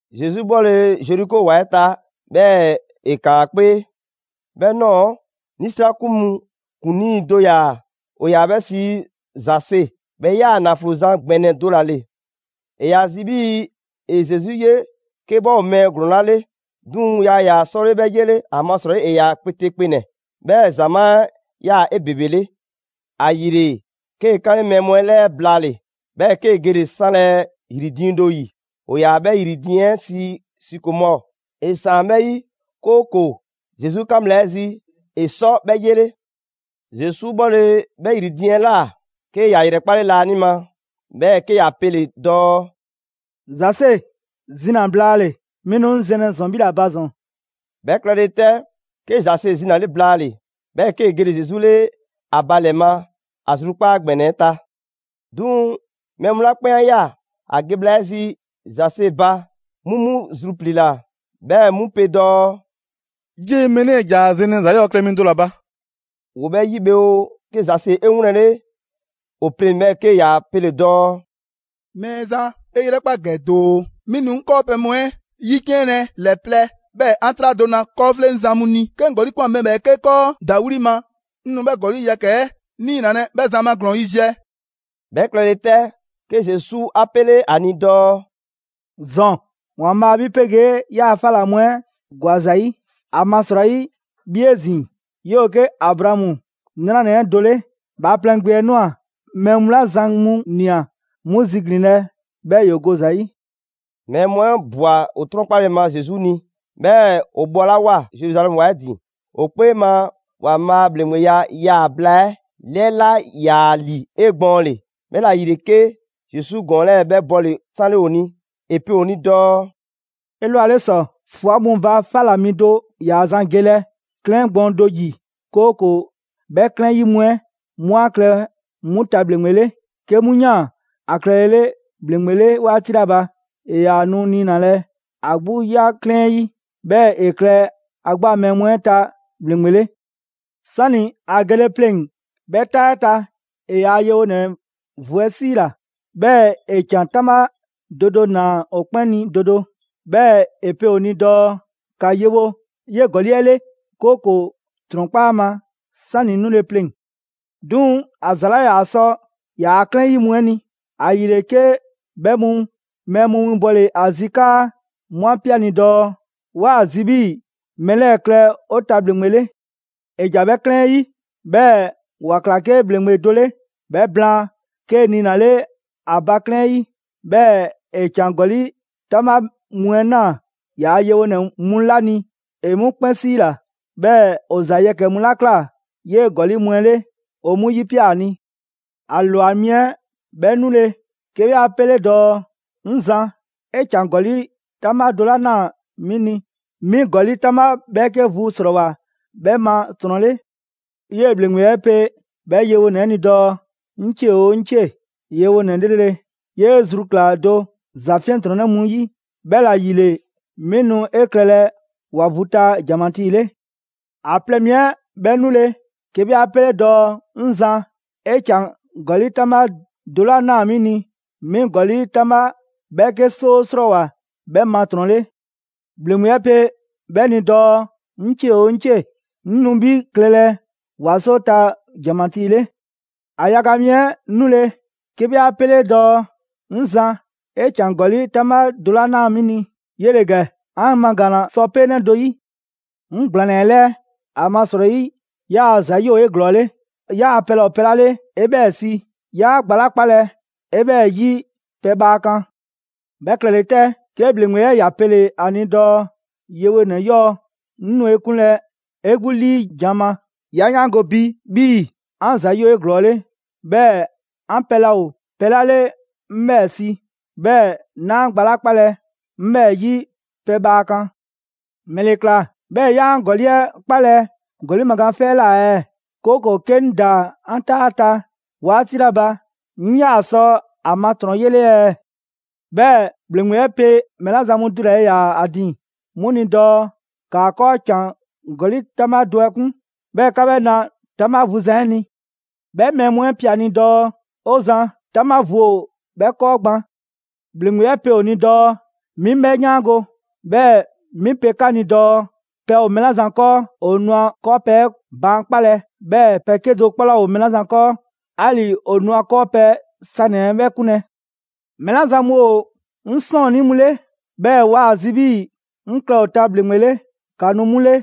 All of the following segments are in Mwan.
Zesu 'bhɔle‑ Zeriko ‑wa 'ɛ ta, 'bhɛɛ‑ ‑e ‑kaan ‑a 'kpee. 'Bhɛ ꞊nɔɔ 'nisrakun mu ‑kuŋlii do ‑yaa, ‑o 'yaa‑ 'bhɛ sii Zase. 'Bhɛ 'yaa‑ ‑naflo zan ‑gbɛnɛ do ‑la ‑le. ‑E ‑yaa ‑a zi 'bhii‑ ‑e Zesu 'ye 'ke 'bhɛ ‑o mɛɛ ‑glɔɔn 'la 'le; 'duŋ‑ yaa ‑yaa 'sɔle 'bhɛ 'yele. ‑Amasrɔyi ‑e ‑yaa kpeteekpenɛ, 'bhɛɛ‑ ‑zamaa' 'ɛ ꞊yaa 'ebebele. ‑Ayile, 'kee‑ 'kanle mɛɛ mu 'ɛ 'lɛɛ blaale‑, 'bhɛɛ‑ 'kee‑ gele‑ 'sanlɛ‑ ‑yri diiŋ do 'yi. ‑O ‑yaa 'bhɛ ‑yri diiŋ 'ɛ sii sikomɔɔ. ‑E ‑saan 'bhɛ 'yi, 'kooko‑ Zesu 'kan bhla 'ɛ zi, ‑e sɔ 'bhɛ 'yele. Zesu 'bhɔle‑ 'bhɛ ‑yri diiŋ 'ɛ ꞊la, 'ke ‑ya ‑yrɛkpale laanima, 'bhɛɛ‑ 'ke ‑ya pele‑ dɔɔ: «Zase, zina‑ blaale‑, 'mi nu 'ŋ zɛnlɛ 'bhi ‑la ba ‑zɔn.» 'Bhɛ klɛle 'tɛ, 'ke Zase zinale blaale‑, 'bhɛɛ‑ 'kee‑ gele‑ Zesu 'le ‑a ba ‑lɛ ma, ‑a zrukpaa' ‑gbɛnɛ 'ɛ ta. 'Duŋ‑ mɛɛ mu 'la 'kpɛn 'a ꞊ya ‑a ge bhla 'ɛ zi Zase ba, 'mu 'mu zrupliila, 'bhɛɛ‑ 'mu pe dɔɔ: «'Yee‑ mɛɛ 'lɛɛ‑ ‑ja ‑a zɛnlɛ ‑za 'yɔɔ klɛ mi do ‑la ba.» ‑Woo 'bhɛ 'yi bhe oo, 'ke Zase 'e 'wlɛnle ‑o pleŋ‑, 'bhɛɛ‑ 'ke ‑ya pele‑ dɔɔ: «Mɛɛzan, 'E 'yrɛkpa ‑gɛ doo, 'mi nu 'ŋ 'kɔɔpɛ‑ mu 'ɛ 'yiciɛnlɛ ‑lɛ plɛ, 'bhɛɛ‑ 'an 'traa do na 'kɔɔfleŋzan mu ni. 'Ke 'ŋ ‑gɔli' ꞊kwan mɛɛ ‑bhɛɛke' 'kɔɔ ‑dawli' ma, 'ŋ nu 'bhɛ ‑gɔli' yɛkɛ‑ 'ɛ 'niinalɛ 'bhɛ zan ma ‑glɔɔn yiziɛ.» 'Bhɛ klɛle 'tɛ, 'ke Zesu 'a 'pele ‑a ni dɔɔ: «‑Zɔn, ‑Waanbhaa' 'bhi 'pegee 'yaa‑ 'fa ꞊la mu 'ɛ ‑gwa ‑za 'yi; ‑amasrɔyi 'bhi 'ezin‑, 'yoo‑ 'ke Abraamu 'nranɛ‑ 'ɛ do 'le. Bhaaplɛŋ Gbe 'ɛ ꞊nwa mɛɛ mu 'la zan mu ꞊nia 'mu ziglinlɛ 'bhɛɛ‑ ‑yoo go ‑za 'yi.» Mɛɛ mu 'ɛ ꞊bwa ‑o 'trɔnkpale ma Zesu ni, 'bhɛɛ‑ ‑o bhɔlawoa Zeruzalɛmu ‑wa 'ɛ ‑din, ‑o 'kpee ma, ‑Waanbhaa' a ‑bhleŋgbeya yaa‑ bhla 'ɛ 'lɛɛ 'laa ‑yaa ‑li 'egbɔɔnle. 'Bhɛla‑ ‑yile 'ke Zesu ‑gɔɔn 'lɛɛ‑ 'bhɛ bɔle‑ 'sanle ‑o ni. ‑E pe ‑o ni dɔɔ: «'Elwaleta ‑sɔ, ꞊fwa mu ba 'fa 'la mi do ‑yaa zan gelɛ 'klɛɛn gbɔɔn do ‑yi, 'kooko‑ 'bhɛ 'klɛɛn 'ɛ 'yi mu 'ɛ 'mu 'a klɛ 'mu ta ‑bhleŋgbe 'le. 'Ke 'mu ꞊yaan ‑a klɛlele ‑bhleŋgbe 'le 'waati 'la ba, ‑e ‑yaa nu 'niinalɛ ‑a 'gbu 'ya 'klɛɛn 'ɛ 'yi, 'bhɛɛ ‑e klɛ ‑a 'gbu a mɛɛ mu 'ɛ ta ‑bhleŋgbe 'le. 'Sani‑ ‑a gele pleŋ‑ 'bhɛ 'taa 'ɛ ta, ‑e ‑yaa' yewonɛ vu 'ɛ 'siila‑, 'bhɛɛ‑ ‑e ‑can 'taŋbha do do ꞊naa ‑o 'kpɛn ni do do. 'Bhɛɛ‑ ‑e pe ‑o ni dɔɔ: ‹‑Ka yewo 'yee‑ ‑gɔli' 'ɛ 'le, 'kooko‑ ‑trɔnkpa' ‑a ma 'sani‑ 'ŋ 'nule‑ pleŋ‑.› 'Duŋ‑ ‑a ‑za 'laa ‑yaa sɔ ‑yaa 'klɛɛn 'yi mu 'ɛ ni, ‑ayile 'ke 'bhɛ mu mɛɛ mu winbɔle ‑a zi 'kaa 'mu 'a pe 'a ni dɔɔ: ‹'Waa‑ zi 'bhii‑ mɛɛ 'lɛɛ‑ klɛ 'o ta ‑bhleŋgbe 'le.› ‑E ‑ja 'bhɛ 'klɛɛn 'ɛ 'yi, 'bhɛɛ‑ ‑wa ꞊kla 'ke ‑bhleŋgbe do 'le. 'Bhɛ blaan, 'kee‑ niinale ‑a ba 'klɛɛn 'ɛ 'yi. 'Bhɛɛ‑ ‑e ‑can ‑gɔli' 'taŋbha mu 'ɛ ꞊naa ‑yaa yewonɛ mu 'la ni, ‑e 'mu 'kpɛn ‑siila, 'bhɛɛ‑ ‑o ‑za yɛkɛ‑ mu 'la ꞊kla 'yee‑ ‑gɔli' mu 'ɛ 'le, ‑o 'mu 'yipia‑ ‑a ni. ‑A lwa mi 'ɛ 'bhɛ 'nule‑, 'ke 'bhɛ 'a 'pele dɔɔ: ‹'Ŋ Zan, 'e ‑can ‑gɔli' 'taŋbha do 'la ꞊naa 'mi ni, 'mi ‑gɔli' 'taŋbha 'bhɛɛke vu ‑srɔɔwoa 'bhɛ ma ‑trɔn 'le.› 'Yee‑ ‑bhleŋgbe 'ɛ pe 'bhɛ yewonɛ 'ɛ ni dɔɔ: ‹'Ŋ 'cie oo 'ŋ 'cie‑! Yewonɛ 'lrele‑. 'Yee‑ zru ‑kla do ‑za 'fiɛntrɔnnɛ mu 'yi, 'bhɛla‑ ‑yile, 'mi nu 'e klɛlɛ ‑wa vu ta ‑janmatii 'le.› ‑A plɛ mi 'ɛ 'bhɛ 'nule‑, 'ke 'bhɛ 'a 'pele dɔɔ: ‹'Ŋ Zan, 'e ‑can ‑gɔli' 'taŋbha do 'la ꞊naa 'mi ni, 'mi ‑gɔli' 'taŋbha 'bhɛɛke 'soo 'srɔɔwoa‑ 'bhɛ ma ‑trɔn 'le.› ‑Bhleŋgbe 'ɛ pe 'bhɛ ni dɔɔ: ‹'Ŋ 'cie oo 'ŋ 'cie‑! 'Ŋ nu 'bhi klɛlɛ ‑wa 'soo ta ‑janmatii 'le.› ‑A yaga mi 'ɛ 'nule, 'ke 'bhɛ 'a 'pele dɔɔ: ‹'Ŋ Zan, 'e ‑can ‑gɔli' 'taŋbha do 'la ꞊naa 'mi ni, 'yele‑ ‑gɛ, 'an magaanna sɔ 'peenɛ do 'yi. 'Ŋ ‑gblaanna 'e 'lɛɛ, ‑amasrɔyi 'yaa‑ ‑za 'yi ‑o 'eglɔɔle. 'Yaa‑ pɛ laa ‑o pɛ 'la 'le, 'e 'bhɛɛ‑ si. 'Yaa gba 'la 'kpalɛ‑, 'e 'bhɛɛ‑ 'yi pɛbhaa kan.› 'Bhɛ klɛle 'tɛ, 'ke ‑bhleŋgbe 'ɛ ‑ya pele‑ ‑a ni dɔɔ: ‹Yewonɛ 'yɔɔ‑, 'ŋ nu 'e 'kunlɛ‑ 'e 'gbu 'liijan‑ ma. 'Ya 'yaango‑ bi 'bhii‑ 'an ‑za 'yi ‑o 'eglɔɔle, 'bhɛɛ‑ 'an pɛ laa ‑o pɛ 'la 'le 'ŋ 'bhɛɛ‑ si. 'Bhɛɛ‑ 'naa gba 'la 'kpalɛ‑, 'ŋ 'bhɛɛ‑ 'yi pɛbhaa kan. ‑Mɛle ꞊kla 'bhɛɛ‑ 'yaa 'an ‑gɔli' 'ɛ 'kpalɛ‑ ‑gɔli' magaan 'fɛ 'ɛ ꞊la ɛɛ, 'kooko‑ 'ke 'ŋ ‑daa 'an 'taa 'ɛ ta 'waati 'la ba, 'ŋ 'yaa‑ sɔ ‑a ma ‑trɔn 'yele ɛɛ?› 'Bhɛɛ‑ ‑bhleŋgbe 'ɛ pe mɛɛ 'la zan mu dulale ‑yaa ‑a ‑din 'mu ni dɔɔ: ‹‑Kaa 'kɔɔ ‑can ‑gɔli' 'taŋbha do 'ɛ 'kun, 'bhɛɛ‑ ‑ka 'bhɛ 'na 'taŋbha vu zan 'ɛ ni.› 'Bhɛ mɛɛ mu 'ɛ pe ‑a ni dɔɔ: ‹'O Zan, 'taŋbha vu ‑o 'bhɛ 'kɔɔ gban.› ‑Bhleŋgbe 'ɛ pe ‑o ni dɔɔ: ‹'Mi 'bhɛ 'yaango‑, 'bhɛɛ‑ 'mi pe 'ka ni dɔɔ pɛ ‑o mɛɛ 'la zan 'kɔɔ, ‑o nu ‑a 'kɔɔpɛ‑ 'ɛ baankpalɛ, 'bhɛɛ‑ pɛ 'kedo‑ 'kpɔ 'laa ‑o mɛɛ 'la zan 'kɔɔ, 'ali‑ ‑o nu ‑a 'kɔɔpɛ‑ sanɛ‑ 'ɛ 'bhɛ 'kunlɛ‑. Mɛɛ 'la zan mu ‑o 'ŋ 'sɔɔnnii mu 'le 'bhɛɛ‑ waa ‑a zi 'bhii‑ 'ŋ klɛ ‑o ta ‑bhleŋgbe 'le, ‑ka nu 'mu ‑le,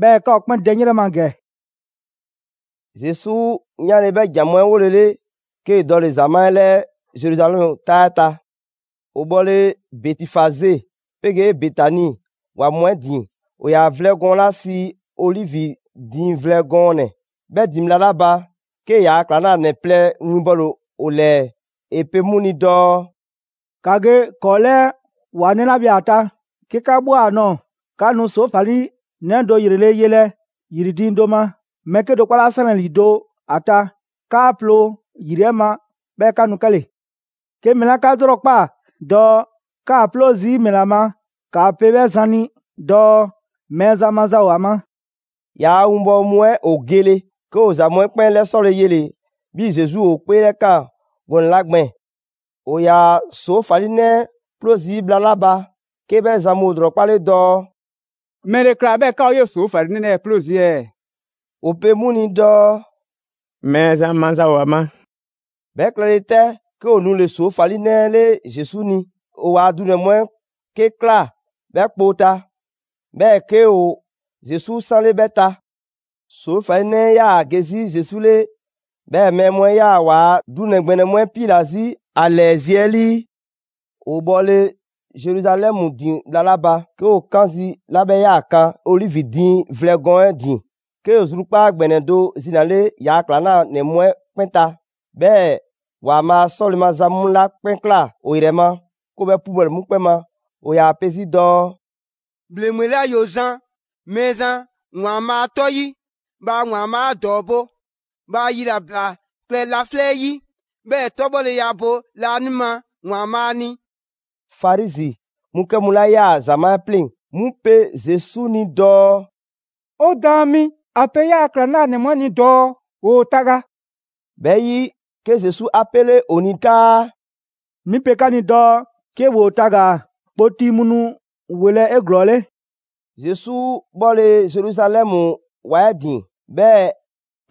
'bhɛɛ‑ 'ka ‑o 'kpɛn dɛ 'ŋ 'yrɛ ma ‑gɛ.›» Zesu 'yanle‑ 'bhɛ ‑jan mu 'ɛ 'wolele, 'kee dɔle‑ ‑zamaa' 'ɛ ‑lɛɛ Zeruzalɛmu 'taa 'ɛ ta. ‑O bhɔle Bɛtifaze 'pegee Betani ‑wa mu 'ɛ ‑din, ‑o ‑yaa vlɛ gɔɔn 'la sii Olivi diiŋ vlɛ gɔɔnɛ‑ 'bhɛ ‑din bhla 'la ba, 'kee‑ yaa ‑klaŋlanɛ plɛ winbɔle ‑o ‑lɛɛ. ‑E pe 'mu ni dɔɔ: «‑Ka ge ‑kɔɔ' 'lɛɛ ‑wa 'nɛ 'la bhe ‑a ta. 'Ke 'ka ꞊bhwa ‑a nɔɔ‑, 'ka nu ‑soofalinɛ do ‑yrele' yelɛ ‑yri diiŋ do ma, mɛɛ ‑bhɛɛke' do 'kpɔ 'laa 'sanlɛ‑ ‑lido' ‑a ta. 'Kaa‑ 'ploo‑ ‑yri 'ɛ ma, 'bhɛɛ‑ ‑ka nu 'kɛle‑. 'Ke mɛɛ 'la 'ka 'lrɔkpaa‑ dɔɔ 'kaa‑ 'ploo zii' ‑mɛla ma, ‑kaa pe 'bhɛ zan ni dɔɔ: ‹Mɛɛzan maza ‑o ‑a ma.›» ‑Yaa' winbɔwo mu 'ɛ ‑o gele, 'ke ‑o ‑za mu 'ɛ 'kpɛn 'lɛsɔle yele‑ 'bhii‑ Zesu ‑o 'kpeelɛkaan gɔnɛ‑ 'la gbɛɛn‑. ‑O ‑yaa ‑soofalinɛ 'ɛ 'ploo zii' bhla 'la ba, 'ke bhɛ zan mu ‑o ‑lrɔkpale dɔɔ: «‑Mɛle ꞊kla 'bhɛɛ 'ka ‑o 'yee‑ ‑soofalinɛ 'lɛɛ‑ 'ploo zii' ɛɛ?» ‑O pe 'mu ni dɔɔ: «Mɛɛzan maza ‑o ‑a ma.» 'Bhɛ klɛle 'tɛ, 'ke ‑o nule‑ ‑soofalinɛ 'ɛ 'le Zesu ni. ‑O ‑waa' dunɛ‑ mu 'ɛ 'ke ꞊klaa 'bhɛ kpoo ta, 'bhɛɛ‑ 'ke ‑o Zesu 'sanle 'bhɛ ta. ‑Soofalinɛ 'ɛ 'yaa‑ ge 'zi Zesu 'le, 'bhɛɛ‑ mɛɛ mu 'ɛ ꞊yaa waa dunɛ‑ ‑gbɛnɛ mu 'ɛ 'piila‑ 'zi ‑a ‑lɛɛ zi 'ɛ 'lii. ‑O bhɔle Zeruzalɛmu ‑din bhla 'la ba, 'ke ‑o kan zi 'la 'bhɛ 'yaa‑ kan Olivi diiŋ vlɛ gɔɔn 'ɛ ‑din, 'ke zrukpaa' ‑gbɛnɛ do zinale ‑yaa' ‑klaŋlanɛ mu 'ɛ 'kpɛn ta, 'bhɛɛ‑ ‑Waanbhaa' 'sɔle‑ maza mu 'la 'kpɛn ꞊kla ‑o ‑yrɛ ma, 'ke ‑o 'bhɛ 'pubɔle 'mu 'kpɛn ma. ‑O ‑yaa pe 'zi dɔɔ: «‑Bhleŋgbe 'la ‑yoo zan Mɛɛzan ‑Waanbhaa' 'tɔ 'yi, bhaa ‑Waanbhaa' 'a ‑dɔɔbo'!» «Bhaa yilabla klɛ laflɛ' 'yi, 'bhɛɛ‑ 'tɔbhɔleya bo laanima ‑Waanbhaa' ni.» Farizi mu 'kɛ mu 'la 'yaa‑ ‑zamaa' 'ɛ 'pleŋ‑, 'mu pe Zesu ni dɔɔ: «'O Daan mi, ‑a pe 'yaa‑ ‑klaŋlanɛ mu 'ɛ ni dɔɔ ‑woo taga.» 'Bhɛ 'yi, 'ke Zesu 'a 'pele ‑o ni 'kaa: «'Mi pe 'ka ni dɔɔ 'ke ‑woo tagaa‑, kpoti mu nu ‑welɛ' 'eglɔɔle.» Zesu 'bhɔle‑ Zeruzalɛmu ‑wa 'ɛ ‑din, 'bhɛɛ‑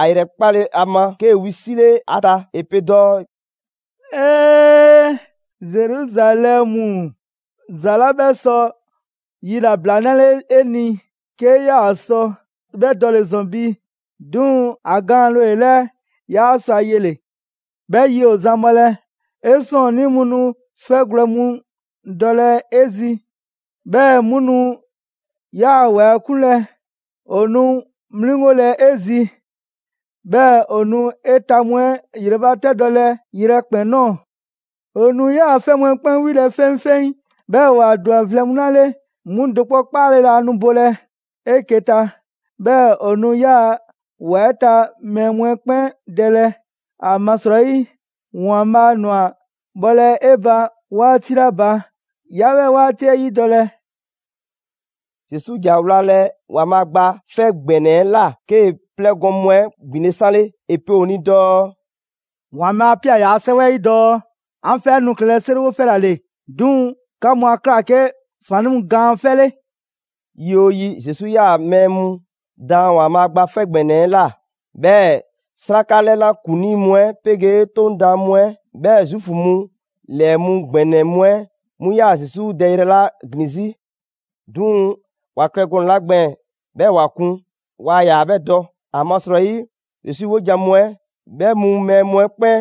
‑a ‑yrɛkpale ‑a ma, 'kee‑ wisile ‑a ta. ‑E pe dɔɔ: «'Ee, Zeruzalɛmu! ‑Za 'la 'bhɛ sɔ yilabla 'nale 'e ni, 'kee ꞊yaa sɔ 'bhɛ dɔle‑ ‑zɔn bi. 'Duŋ‑ ‑a gaanle ‑o 'e 'lɛɛ, 'yaa sɔ ‑a yele‑. 'Bhɛ yi ‑o zan bhɔlɛ, 'e 'sɔɔnnii mu nu 'fɛgwlɛ‑ mu dɔlɛ 'e zi, 'bhɛɛ‑ 'mu nu 'yaa‑ ‑wa 'ɛ 'kunlɛ‑. ‑O nu 'mliŋgolɛ 'e zi, 'bhɛɛ‑ ‑o nu 'e ta mu 'ɛ 'yrɛbatɛdɔlɛ yrɛkpɛn‑ ꞊nɔɔ. ‑O nu 'yaa‑ 'fɛ mu 'ɛ 'kpɛn 'wilɛ‑ 'feŋfeŋ, 'bhɛɛ‑ ‑wa ‑dwa vlɛ mu 'la 'le 'mu do 'kpɔ 'kpaale‑ laa nu bolɛ‑ 'eke‑ ta. 'Bhɛɛ‑ ‑o nu 'yaa‑ ‑wa 'ɛ ta mɛɛ mu 'ɛ 'kpɛn dɛlɛ, ‑amasrɔyi ‑Waanbhaa' ꞊nwa bhɔlɛ 'e ba 'waati 'la ba, 'yaa 'bhɛ 'waati 'ɛ 'yidɔlɛ!» Zesu ‑ja wlalɛ ‑Waanbhaa' Gba 'Fɛ ‑Gbɛnɛ 'ɛ ꞊la, 'kee 'plɛɛgɔn‑ mu 'ɛ ‑gbinle' 'sanle. ‑E pe ‑o ni dɔɔ: «‑Waanbhaa' 'a ꞊pia ‑yaa' 'Sɛwɛ 'ɛ 'yi dɔɔ: ‹'An 'fɛ 'ɛ nu klɛlɛ 'seriwo 'fɛ ‑la ‑le, 'duŋ‑ 'ka mu 'a ꞊kla 'ke ‑faannii' mu gaan 'fɛ 'le!›» Yi 'oo yi, Zesu 'yaa‑ mɛɛ mu daan ‑Waanbhaa' Gba 'Fɛ ‑Gbɛnɛ 'ɛ ꞊la. 'Bhɛɛ‑ 'sraka 'lɛna ‑kuŋlii mu 'ɛ 'pegee 'Toŋ daan mu 'ɛ 'bhɛɛ‑ Zuufu mu ‑lɛɛ mu ‑gbɛnɛ mu 'ɛ 'mu 'yaa‑ Zesu dɛyrɛ ‑la ‑glin 'zi. 'Duŋ‑ ‑wa klɛ gɔnɛ‑ 'la gbɛɛn‑ 'bhɛɛ‑ ‑wa kun, waa ‑yaa 'bhɛ dɔ; ‑amasrɔyi Zesu 'wojan‑ mu 'ɛ 'bhɛ mu mɛɛ mu 'ɛ 'kpɛn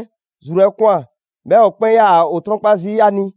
zru 'ɛ ꞊kwan, 'bhɛɛ‑ ‑o 'kpɛn 'yaa‑ ‑o 'trɔnkpa zii' ‑a ni.